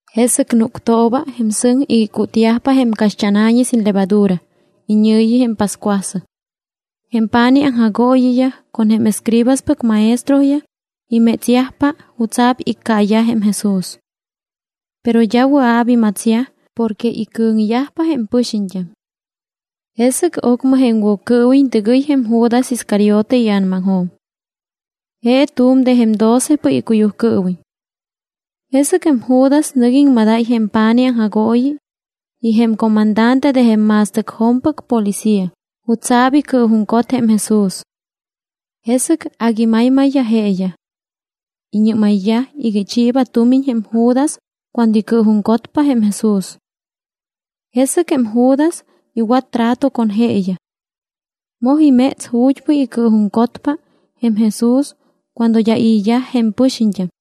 Jesɨc núctooba jém sɨŋ iga icútyajpa jém caxt́ána̱ñi sin levadura, iñɨ̱yi jém pascuasɨŋ. Jém pa̱nij aŋjagooyiyaj con jém escribaspɨc maestroyaj imétsyajpa jutsa̱p iccaayaj jém Jesús. Pero d́a wɨa̱p imatsyaj porque icɨ̱ŋyajpa jém pɨxiñt́am. Jesɨc ocmɨ jém Woccɨɨwiñ tɨgɨy jém Judas Iscariote ia̱namaŋjo̱m. Je tu̱m de jém docepɨc icuyujcɨɨwiñ. Jesɨc jém Judas nɨc iŋmadáy jém pa̱nij aŋjagooyi y jém comandante de jém ma̱stɨcjo̱mpɨc policía jutsa̱p icɨɨjuŋcot jém Jesús. Jesɨc agui maymayyaj jeeyaj. Iñɨ́mayyaj iga ichiiba tumiñ jém Judas cuando icɨɨjuŋcotpa jém Jesús. Jesɨc jém Judas iwat trato con jeeyaj. Moj iméts ju̱t́pɨc icɨɨjuŋcotpa jém Jesús cuando d́a i̱yaj jém pɨxiñt́am.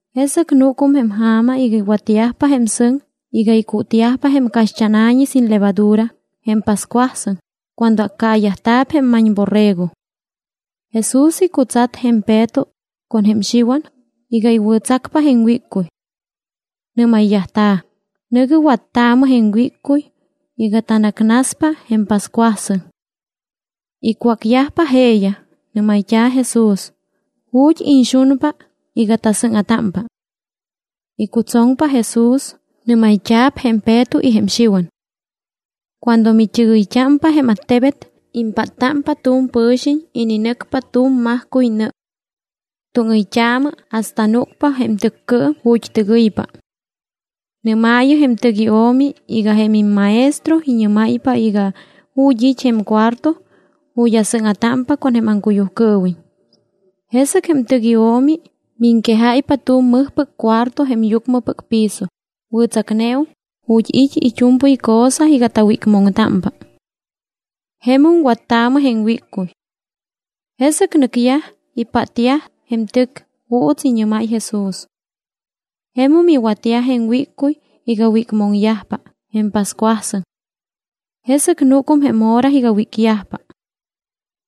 Jesɨc núcum jém ja̱ma iga iwatyajpa jém sɨŋ iga icútyajpa jém caxt́ána̱ñi sin levadura, jém pascuasɨŋ cuando accaayajta̱p jém ma̱ñborrego. Jesús icutsat jém Peto con jém Xiwan iga iwɨ̱tsacpa jém wíccuy. Nɨ́mayyajta̱: —Nɨ̱gɨ wattaamɨ jém wíccuy iga tanacnaspa jém pascuasɨŋ. Icwácyajpa jeeyaj, nɨ́mayt́a̱ Jesús: —¿Ju̱t́ iñxunpa iga tasɨ́ŋa̱támpa? Icutsoŋpa Jesús, nɨ́mayt́a̱p jém Peto y jém Xiwan: —Cuando mit́ɨgɨyt́ámpa jém attebet, impáttámpa tu̱m pɨ̱xiñ ininɨcpa tu̱m majcuy nɨ. Túŋɨyt́aamɨ hasta núcpa jém tɨccɨɨm ju̱t́ tɨgɨypa. Nɨ́maayɨ jém tɨc io̱mi iga jém imMaestro iñɨ́máypa iga: “¿Ju̱t́ it́ jém cuarto ju̱t́ asɨ́ŋa̱támpa con jém aŋcuyujcɨɨwiñ?” Jesɨc jém tɨc io̱mi miŋquejáypa tu̱m mɨjpɨc cuarto jém yucmɨpɨc piso, wɨ̱tsacneum, ju̱t́ it́ it́u̱mpɨy cosa iga tawícmoŋtámpa. Jemum wattaamɨ jém wíccuy. Jesɨc nɨcyaj, ipátyaj jém tɨc juuts iñɨ́máy Jesús. Jemum iwatyaj jém wíccuy iga wícmoŋyajpa jém pascuasɨŋ. Jesɨc núcum jém hora iga wícyajpa.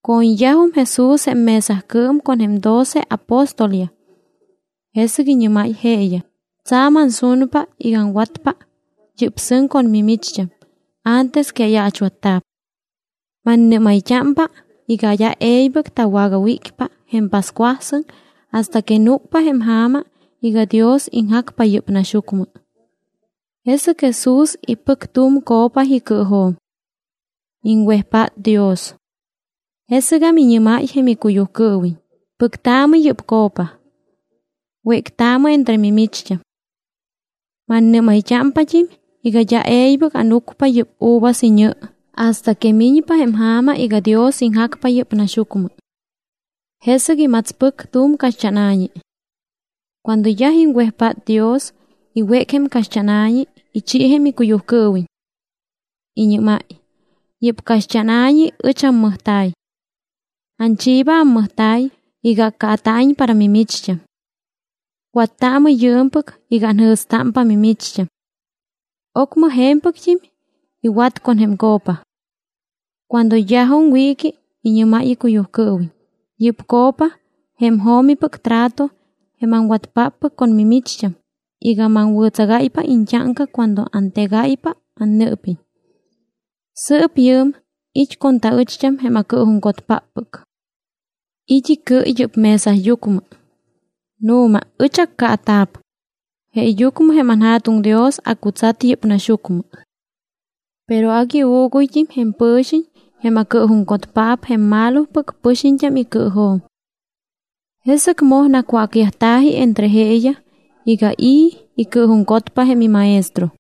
Co̱ñyajum Jesús jém mesacɨɨm con jém doce apóstolyaj. Jesɨc iñɨ́máy jeeyaj: —Tsa̱m ansunpa iga aŋwatpa yɨ́p sɨŋ con mimicht́am antes que ayaachwatta̱p. Mannɨ́mayt́ámpa iga d́a e̱ybɨc tawagawícpa jém pascuasɨŋ hasta que núcpa jém ja̱ma iga Dios iŋjacpa yɨ́p naxyucmɨ. Jesɨc Jesús ipɨc tu̱m copa icɨɨjo̱m. Iŋwejpát Dios. Jesɨgam iñɨ́máy jém icuyujcɨɨwiñ: —Pɨctaamɨ yɨ́p copa. Wéctaamɨ entre mimicht́am. Mannɨ́mayt́ámpat́im iga d́a e̱ybɨc ánucpa yɨ́p uvas iñɨ hasta que miñpa jém ja̱ma iga Dios iŋjacpa yɨ́p naxyucmɨ. Jesɨc imatspɨc tu̱m caxt́ána̱ñi. Cuando yaj iŋwejpát Dios, iwéc jém caxt́ána̱ñi, ichi jém icuyujcɨɨwiñ. Iñɨ́máy: —Yɨ́p caxt́ána̱ñi ɨch ammɨjta̱y. Anchiiba ammɨjta̱y iga accaata̱iñ para mimicht́am. Wattaamɨ yɨɨmpɨc iga anjɨ̱stámpa mimicht́am. Ocmɨ je̱mpɨct́im iwat con jém copa. Cuando yajum wiiqui, iñɨ́máy icuyujcɨɨwiñ: —Yɨ́p copa jém jo̱mipɨc trato jém aŋwatpáppɨc con mimicht́am iga maŋwɨ̱tsagáypa iñt́áŋca cuando antegáypa annɨɨpiñ. ’Sɨɨp yɨɨm it́ con taɨcht́am jém acɨɨjuŋcotpáppɨc. It́ icɨ yɨ́p mesayucmɨ. Nu̱ma ɨch accaata̱p, jeeyucmɨ jém anJa̱tuŋ Dios acutsat yɨ́p naxyucmɨ. Pero agui uuguyt́im jém pɨ̱xiñ jém acɨɨjuŋcotpaap jém malopɨc pɨxiñt́am icɨɨjo̱m. Jesɨc moj nacwácyajta̱ji entre jeeyaj iga i̱ icɨɨjuŋcotpa jém iMaestro.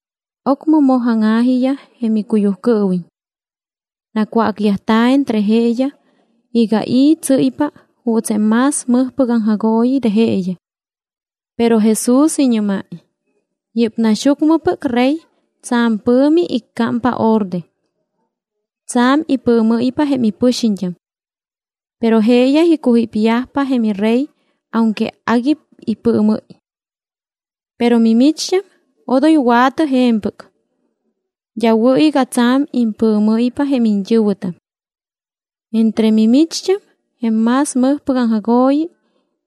Ocmɨ moj áŋa̱jiyaj jém icuyujcɨɨwiñ. Nacwácyajta̱ entre jeeyaj iga i̱ tsɨ́ypa juuts jém más mɨjpɨc aŋjagooyi de jeeyaj. Pero Jesús iñɨ́máy: —Yɨ́p naxyucmɨpɨc rey tsa̱m pɨ̱mi iccámpa orde. Tsa̱m ipɨɨmɨ́ypa jém ipɨxiñt́am. Pero jeeyaj icujípyajpa jém irey aunque agui ipɨɨmɨ́y. Pero mimicht́am odoy wa̱tɨ je̱mpɨc. D́a wɨ̱ iga tsa̱m impɨɨmɨ́ypa jém iñt́ɨ̱wɨtam. Entre mimicht́am jém más mɨjpɨc aŋjagooyi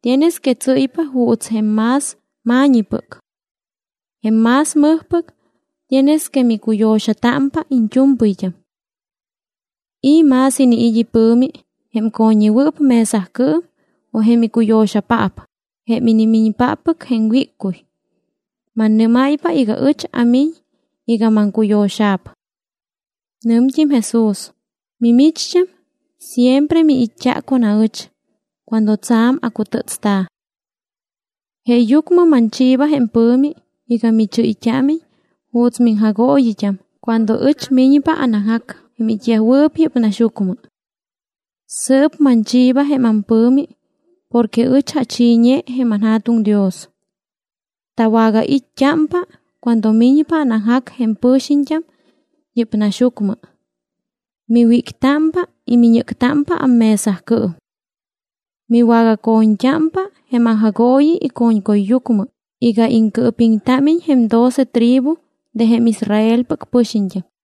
tienes que tsɨ́ypa juuts jém más ma̱ñipɨc. Jém más mɨjpɨc tienes que micuyo̱xatámpa iñt́u̱mpɨyt́am. ¿I̱ más iniit́ ipɨ̱mi, jém co̱ññewɨɨp mesacɨɨm o jém icuyo̱xapaap, jém inimiñpáppɨc jém wíccuy? Mannɨ́máypa iga ɨch amiñ iga maŋcuyo̱xa̱p. Nɨmt́im Jesús: —Mimicht́am siempre miit́t́a con aɨch cuando tsa̱m acutɨ́tsta̱. Jeeyucmɨ manchiiba jém pɨ̱mi iga michɨ́yt́ámiñ juuts miŋjagooyit́am cuando ɨch miñpa anaŋjac jém it́yajwɨɨp yɨ́p naxyucmɨ. Sɨɨp manchiiba jém ampɨ̱mi porque ɨch achiiñe jém anJa̱tuŋ Dios. Tawagait́t́ámpa cuando miñpa anaŋjac jém pɨxiñt́am yɨ́p naxyucmɨ. Miwíctámpa y miñɨ́ctámpa ammesacɨɨm. Miwagaco̱ñt́ámpa jém aŋjagooyi ico̱ñcuyyucmɨ iga iŋcɨɨpiŋtámiñ jém doce tribu de jém Israelpɨc pɨxiñt́am.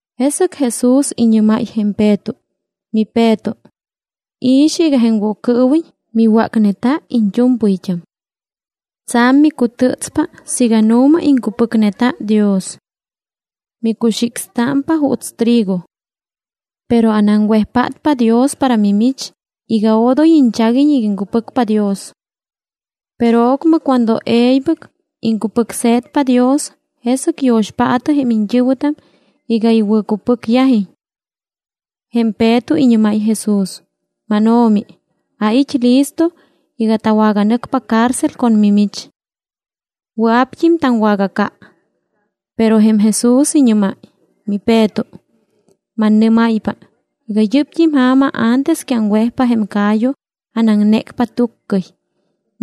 Jesɨc Jesús iñɨ́máy jém Peto: —MiPeto, i̱xɨ iga jém Woccɨɨwiñ miwácneta iñt́u̱mpɨyt́am. Tsa̱m micutɨ́tspa siiga nu̱ma iŋcupɨcneta Dios. Micuxicstámpa juuts trigo. Pero anaŋwejpátpa Dios para mimich iga odoy iñchaguiñ iga iŋcupɨcpa Dios. Pero ocmɨ cuando e̱ybɨc iŋcupɨcse̱tpa Dios, jesɨc yo̱xpaatɨ jém iñt́ɨ̱wɨtam iga iwɨ̱cupɨcyajiñ. Jém Peto iñɨ́máy Jesús: —MánO̱mi, ait́ listo iga tawaganɨcpa cárcel con mimich. Wɨa̱pt́im taŋwagaca. Pero jém Jesús iñɨ́máy: —MiPeto, mannɨ́máypa iga yɨ́pt́im ja̱ma antes que aŋwejpa jém ca̱yu anaŋnécpa túccɨy,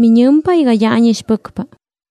miñɨmpa iga d́a ánixpɨcpa.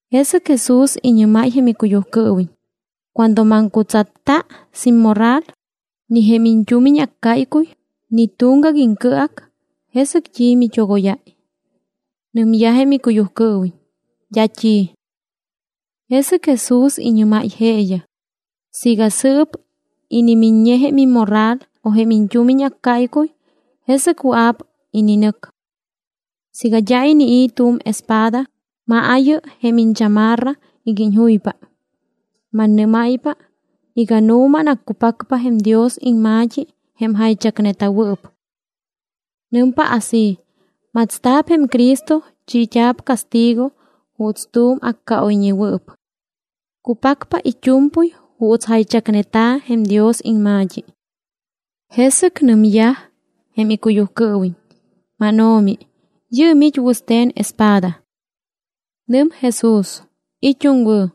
Jesɨc Jesús iñɨ́máy jém icuyujcɨɨwiñ: —Cuando maŋcutsatta sin morral, ni jém iñt́umiñ accáycuy, ni tuŋgac iŋcɨac; ¿jesɨc t́i mit́ogóyáy? Nɨmyaj jém icuyujcɨɨwiñ: —D́a t́i. Jesɨc Jesús iñɨ́máy jeeyaj: —Siiga sɨɨp inimiññe jém immorral o jém iñt́umiñ accáycuy, jesɨc wɨa̱p ininɨc. Siiga d́a inii̱ tu̱m espada, maayɨ jém iñchamarra iga iñjuypa. Mannɨ́máypa iga nu̱ma anaccupacpa jém Dios iŋma̱t́i jém jaychacneta̱wɨɨp. Nɨmpa así: “Matsta̱p jém Cristo, chiit́a̱p castigo juuts tu̱m accaoyñewɨɨp.” Cupacpa it́u̱mpɨy juuts jaychacneta̱ jém Dios iŋma̱t́i. Jesɨc nɨmyaj jém icuyujcɨɨwiñ: —MánO̱mi, yɨɨm it́ wɨste̱n espada. Nɨm Jesús: —It́um wɨ̱.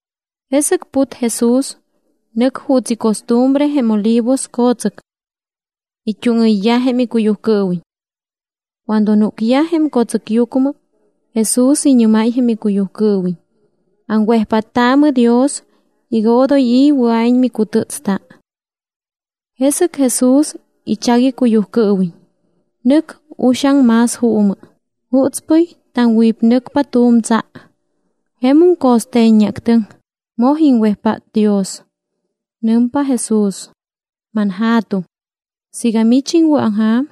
Jesɨc put Jesús, nɨc juuts icostumbre jém Olivos co̱tsɨc. It́úŋɨyyaj jém icuyujcɨɨwiñ. Cuando núcyaj jém co̱tsɨcyucmɨ, Jesús iñɨ́máy jém icuyujcɨɨwiñ: —Aŋwejpáttaamɨ Dios iga odoy i̱ wɨa̱iñ micutɨ́tsta. Jesɨc Jesús ichac icuyujcɨɨwiñ, nɨc uxaŋ más juumɨ, jutspɨy taŋwípnɨcpa tu̱m tsa. Jemum co̱ste̱ññeactɨŋ, moj iŋwejpát Dios. Nɨmpa Jesús: —ManJa̱tuŋ, siiga mich iŋwɨ̱aŋja̱m,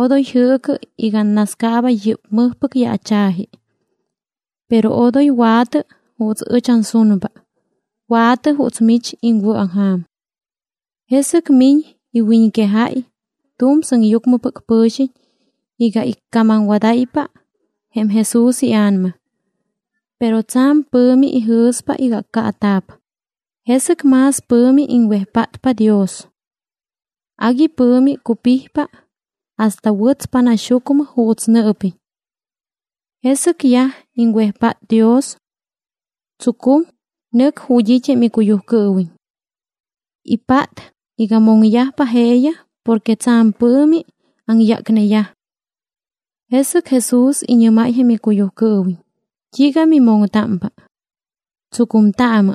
odoy jɨɨcɨ iga annascaaba yɨ́p mɨjpɨc yaacha̱ji. Pero odoy wa̱tɨ juuts ɨch ansunpa, wa̱tɨ juuts mich iŋwɨ̱aŋja̱m. Jesɨc miñ iwiñquejáy tu̱m sɨŋyucmɨpɨc pɨ̱xiñ iga iccamamwadáypa jém Jesús ia̱nama. Pero tsa̱m pɨ̱mi ijɨ̱spa iga accaata̱p, jesɨc más pɨ̱mi iŋwejpátpa Dios. Agui pɨ̱mi cupijpa hasta wɨtspa naxyucmɨ juuts nɨɨpiñ. Jesɨc yaj iŋwejpát Dios. Tsucum, nɨc ju̱t́ it́ jém icuyujcɨɨwiñ. Ipát iga moŋyajpa jeeyaj porque tsa̱m pɨ̱mi aŋyácneyaj. Jesɨc Jesús iñɨ́máy jém icuyujcɨɨwiñ: —¿T́iiga mimoŋtámpa? Tsucumtaamɨ.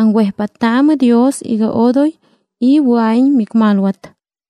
Aŋwejpáttaamɨ Dios iga odoy i̱ wɨa̱iñ micmalwat.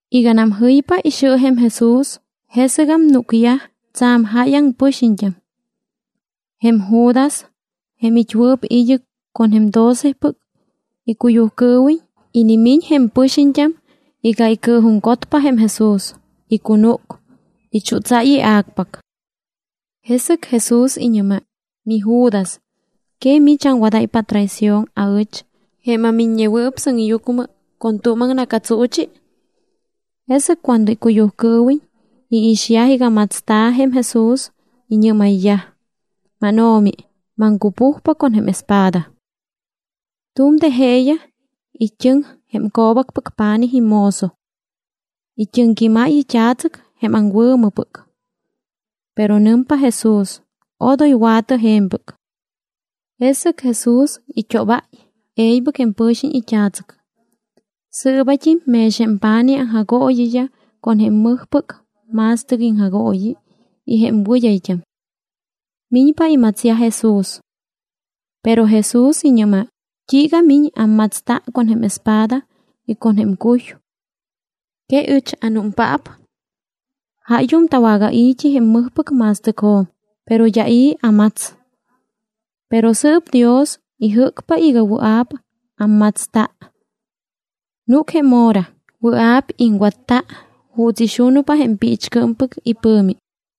Iganam jɨypa ixɨ jém Jesús, jesɨgam núcyaj tsa̱m jáyaŋ pɨxiñt́am. Jém Judas, jém it́wɨɨp id́ɨc con jém docepɨc icuyujcɨɨwiñ, inimiñ jém pɨxiñt́am iga icɨɨjuŋcotpa jém Jesús, icunúc, ichútsáy ia̱cpac. Jesɨc Jesús iñɨ́máy: —MiJudas, ¿que mich aŋwadáypa atraición aɨch, jém aMiññewɨɨp Sɨŋyucmɨ, con tu̱m aŋna̱catsuuchi? Jesɨc cuando icuyujcɨɨwiñ iixyaj iga matsta̱ jém Jesús, iñɨ́mayyaj: —MánO̱mi, ¿maŋcupujpa con jém espada? Tu̱m de jeeyaj it́ɨŋ jém co̱bacpɨc pa̱nij imozo. It́ɨŋquímáy it́a̱tsɨc jém aŋwɨ̱mɨpɨc. Pero nɨmpa Jesús: —Odoy wa̱tɨ je̱mpɨc. Jesɨc Jesús it́óbáy e̱ybɨc jém pɨ̱xiñ it́a̱tsɨc. Sɨɨbat́im mex jém pa̱nij aŋjagooyiyaj con jém mɨjpɨc ma̱stɨc iŋjagooyi y jém wɨd́ayt́am. Miñpa imatsyaj Jesús. Pero Jesús iñɨ́máy: —¿T́iiga miñ ammatsta con jém espada y con jém cuy? ¿Que ɨch anúmpaap? Jáyum tawagai̱t́i jém mɨjpɨc ma̱stɨcjo̱m, pero d́a i̱ ammats. Pero sɨɨp Dios ijɨ́cpa iga wɨa̱p ammatsta. Núc jém hora, wɨa̱p iŋwatta juuts ixunpa jém piichcɨɨmpɨc ipɨ̱mi.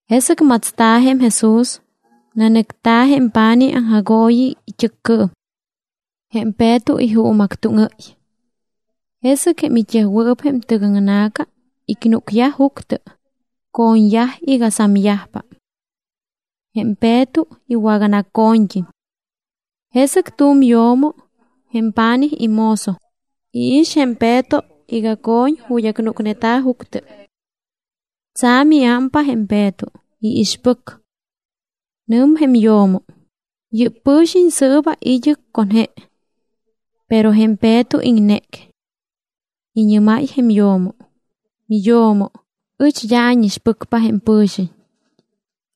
Jesɨc matsta̱ jém Jesús, nanɨcta̱ jém pa̱nij aŋjagooyi it́ɨccɨɨm. Jém Peto ijuumactúŋɨ́y. Jesɨc jém it́yajwɨɨp jém tɨgaŋna̱ca icnúcyaj juctɨ, co̱ñyaj iga samyajpa. Jém Peto iwaganaco̱ñt́im. Jesɨc tu̱m yo̱mo, jém pa̱nij imozo, iix jém Peto iga co̱ñ ju̱t́ acnúcneta̱ juctɨ. Tsa̱m iámpa jém Peto, iixpɨc. Nɨm jém yo̱mo: —Yɨ́p pɨ̱xiñ sɨɨba id́ɨc con je. Pero jém Peto iŋnéc. Iñɨ́máy jém yo̱mo: —Miyo̱mo, ɨch d́a ánixpɨcpa jém pɨ̱xiñ.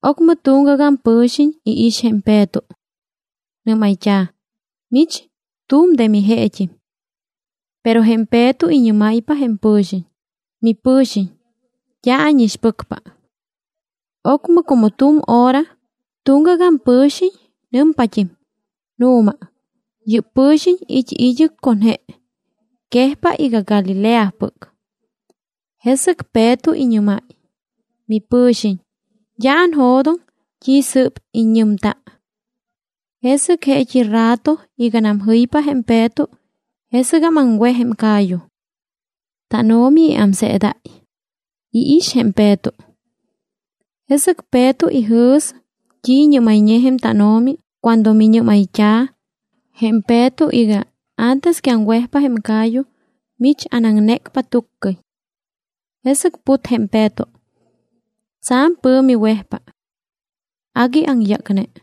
Ocmɨ tuŋgagam pɨ̱xiñ iix jém Peto. Nɨ́mayt́a̱: —¡Mich, tu̱m de mijeet́im! Pero jém Peto iñɨ́máypa jém pɨ̱xiñ: —¡Mipɨ̱xiñ, d́a ánixpɨcpa! Ocmɨ como tu̱m hora, tuŋgagam pɨ̱xiñ nɨmpat́im: —Nu̱ma, yɨ́p pɨ̱xiñ it́ id́ɨc con je, quejpa iga Galileapɨc. Jesɨc Peto iñɨ́máy: —Mipɨ̱xiñ, d́a anjo̱doŋ t́i sɨ́p iññɨmta. Jesɨc jeet́i rato iganam jɨypa jém Peto, jesɨgam aŋwej jém ca̱yu. TánO̱mi iámseedáy, iix jém Peto. Jesɨc Peto ijɨ̱s t́i iñɨ́mayñe jém tánO̱mi cuando miñɨ́mayt́a̱ jém Peto iga: “Antes que aŋwejpa jém ca̱yu, mich anaŋnécpa tuccɨy.” Jesɨc put jém Peto. Tsa̱m pɨ̱mi wejpa. Agui aŋyácne.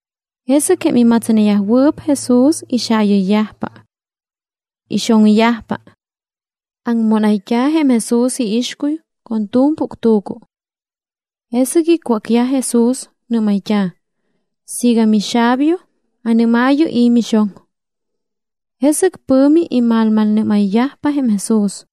Jesɨc jém imatsneyajwɨɨp Jesús ixaayɨyyajpa. Ixoŋyajpa. Aŋmónayt́a̱ jém Jesús iixcuy con tu̱m puctu̱cu. Jesɨc icwácyaj Jesús, nɨ́mayt́a̱: —Siiga mixabio, anɨ́maayɨ i̱ mixoŋ. Jesɨc pɨ̱mi imalmalnɨ́mayyajpa jém Jesús.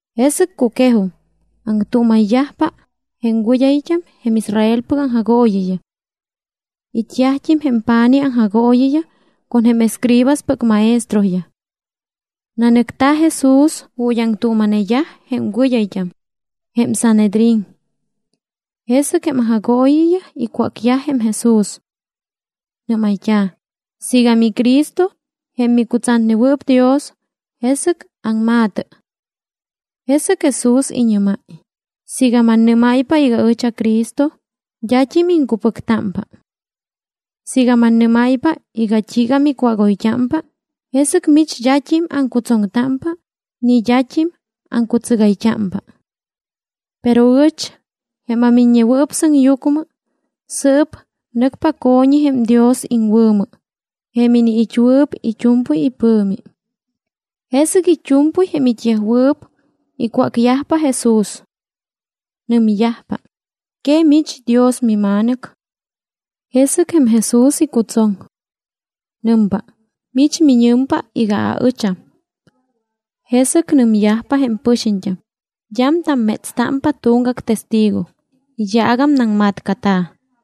Jesɨc cuquejum, aŋtuuma̱yajpa jém wɨd́ayt́am jém Israelpɨc aŋjagooyiyaj. It́yajt́im jém pa̱nij aŋjagooyiyaj con jém escribaspɨc maestroyaj. Nanɨcta̱ Jesús ju̱t́ aŋtuuma̱neyaj jém wɨd́ayt́am, jém Sanhedrín. Jesɨc jém aŋjagooyiyaj icwácyaj jém Jesús. Nɨ́mayt́a̱: —Siiga miCristo, jém micutsatnewɨɨp Dios, jesɨc aŋma̱tɨ. Jesɨc Jesús iñɨ́máy: —Siiga mannɨ́máypa iga ɨch aCristo, d́at́im iŋcupɨctámpa. Siiga mannɨ́máypa iga t́iiga micwágoyt́ampa, jesɨc mich d́at́im aŋcutsoŋtámpa ni d́at́im aŋcutsɨgayt́ámpa. Pero ɨch, jém aMiññewɨɨp Sɨŋyucmɨ, sɨɨp nɨcpa aco̱ñi jém Dios iŋwɨ̱mɨ, jém iniit́wɨɨp it́u̱mpɨy ipɨ̱mi. Jesɨc it́u̱mpɨy jém it́yajwɨɨp icwácyajpa Jesús. Nɨmyajpa: —¿Que mich Dios miMa̱nɨc? Jesɨc jém Jesús icutsoŋ. Nɨmpa: —Mich miñɨmpa iga aɨcham. Jesɨc nɨmyajpa jém pɨxiñt́am: —D́am tammétstámpa tuŋgac testigo, iyaagam naŋmatcata̱.